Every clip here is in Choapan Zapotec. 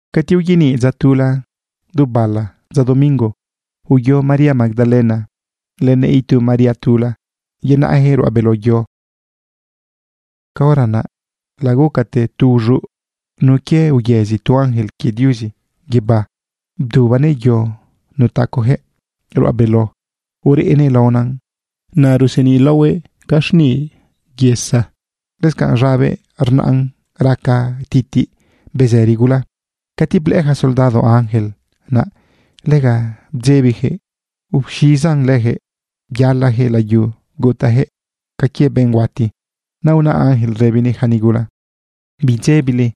Cati uyaniꞌ dza tula du bala dza domingo, uyo María Magdalena lënëꞌ itu María tula yenaꞌjëꞌ ruꞌa beló yo. Caora naꞌ lagucate tu uz̃uꞌ nun quie uyëzi tu ángel quie Diuzi guibá, bdubanëꞌ yo nutacojëꞌ ruꞌa beló, ureꞌnëꞌ laonan. Naꞌ ruseniꞌ laohuëꞌ ca xniꞌ yesa. Lëscanꞌ z̃abëꞌ rnaꞌn raca titiꞌ bezëri gula. Cati blëꞌë ja soldado ángel, naꞌ lega bdzebijëꞌ uz̃izan lëjëꞌ byalajëꞌ layu, gutajëꞌ ca quie benꞌ huati. Naꞌ una ángel rëbinëꞌ ja nigula: ―Bidzebile.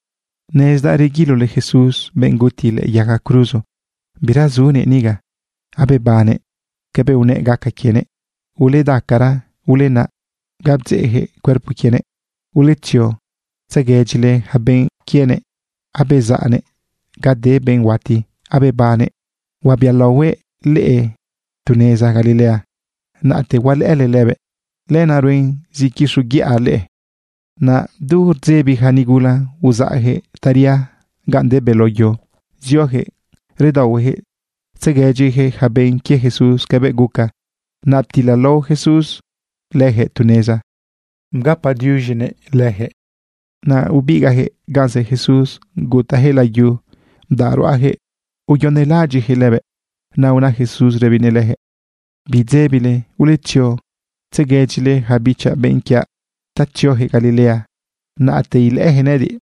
Nezdaꞌ reguilole Jesús, benꞌ guti lëꞌë yaga cruzo. Bira zunëꞌ niga. Abebannëꞌ cabëꞌ unëꞌ gaca quienëꞌ. Uledacara, ulenaꞌ ga bdzeꞌjëꞌ cuerpo quienëꞌ. Uletzio tzeguedyile ja benꞌ quienëꞌ abezaꞌnëꞌ ga de benꞌ huati, abebannëꞌ. Huabialaohuëꞌ leꞌe tu neza Galilea. Naꞌte hualëꞌële lëbëꞌ. Lenaꞌ ruen zi quixoguiꞌa leꞌe. Naꞌ du rdzebi ja nigula, uzaꞌjëꞌ taria gan de beló yo, ziojëꞌ redaohuejëꞌ tzeguedyijëꞌ ja benꞌ quie Jesús cabëꞌ guca. Naꞌ ptilalao Jesús lëjëꞌ tu neza ugapëꞌ diuz̃i lëjëꞌ. Naꞌ ibigaꞌjëꞌ gan zë Jesús gutajëꞌ layu bdaꞌ ruꞌajëꞌ uyonelaꞌadyiꞌjëꞌ lëbëꞌ. Naꞌ una Jesús rëbinëꞌ lëjëꞌ: ―Bidzebile. Uletzio tzeguedyile ja bichaꞌ benꞌ quiaꞌ ta tziojëꞌ Galilea. Naꞌte ilëꞌëjëꞌ nëꞌëdiꞌ.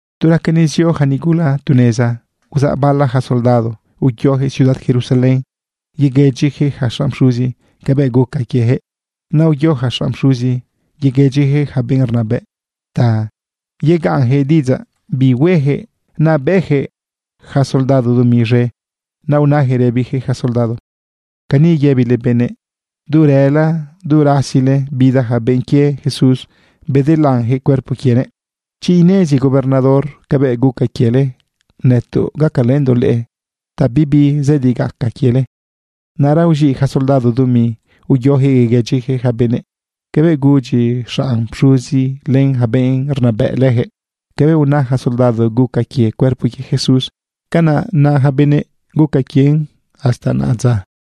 Tu raca nezio ja nigula tu neza, uzaꞌ bala ja soldado uyojëꞌ ciudad Jerusalén yeguëdyijëꞌ ja xanꞌ pxuzi cabëꞌ guca quiejëꞌ. Naꞌ uyo ja xanꞌ pxuzi yeguëdyijëꞌ ja benꞌ rnabëꞌ ta yegaꞌnjëꞌ diꞌidzaꞌ bi huejëꞌ. Naꞌ bëꞌjëꞌ ja soldado dumi z̃e. Naꞌ unajëꞌ rëbijëꞌ ja soldado: ―Cani yëbile benëꞌ. Du rëla du rasile, bida ja benꞌ quie Jesús, bedelanjëꞌ cuerpo quienëꞌ. Chi inezi gobernador cabëꞌ guca quiele, nëtoꞌ gacalëndoꞌ leꞌe ta bibi zëdi gaca quiele. Naꞌra uz̃iꞌ ja soldado dumi, uyojëꞌ yeguëdyijëꞌ ja benëꞌ cabëꞌ gudyi xanꞌ pxuzi len ja benꞌ rnabëꞌ lëjëꞌ. Cabëꞌ una ja soldado guca quie cuerpo quie Jesús, canaꞌ na ja benëꞌ guca quien hasta naꞌadza.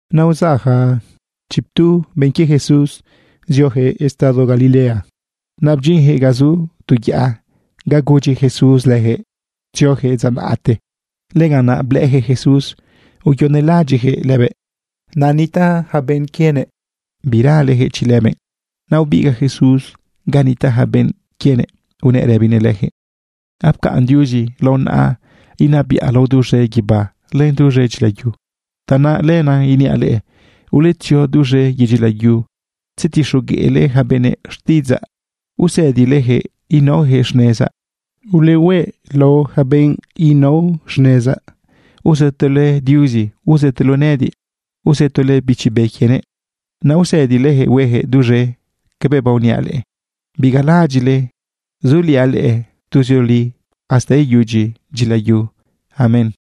Naꞌ uzaꞌ ja chiptu benꞌ quie Jesús ziojëꞌ estado Galilea. Naꞌ bdyinjëꞌ ga zu tu yaꞌa, ga gudyi Jesús lëjëꞌ tziojëꞌ dza naꞌte. Lëganꞌ naꞌ blëꞌëjëꞌ Jesús uyonelaꞌadyiꞌjëꞌ lëbëꞌ. Naꞌ nitaꞌ ja benꞌ quienëꞌ biralejëꞌ chi lëbëꞌ. Naꞌ ubigaꞌ Jesús ganꞌ nitaꞌ ja benꞌ quienëꞌ unëꞌ rëbinëꞌ lëjëꞌ: ―Apcaꞌn Diuzi lao naꞌa inabiꞌa lao duz̃e guibá len duz̃e dyilayu. Tanaꞌ lenaꞌ iniaꞌ leꞌe, uletzio duz̃e yedyi layu tzetixogueꞌle ja benëꞌ xtiꞌidzaꞌ, usëdilejëꞌ inaojëꞌ xnezaꞌ. Ulehueꞌ lao ja benꞌ nao xnezaꞌ uzëtole Diuzi, uzëtole nëꞌëdiꞌ, uzëtole Bichi Be quienëꞌ. Naꞌ usëdilejëꞌ huejëꞌ duz̃e cabëꞌ baoniaꞌ leꞌe. Bigalaꞌadyiꞌle suliaꞌ leꞌe tuzioli hasta iyudyi dyila yu. Amén.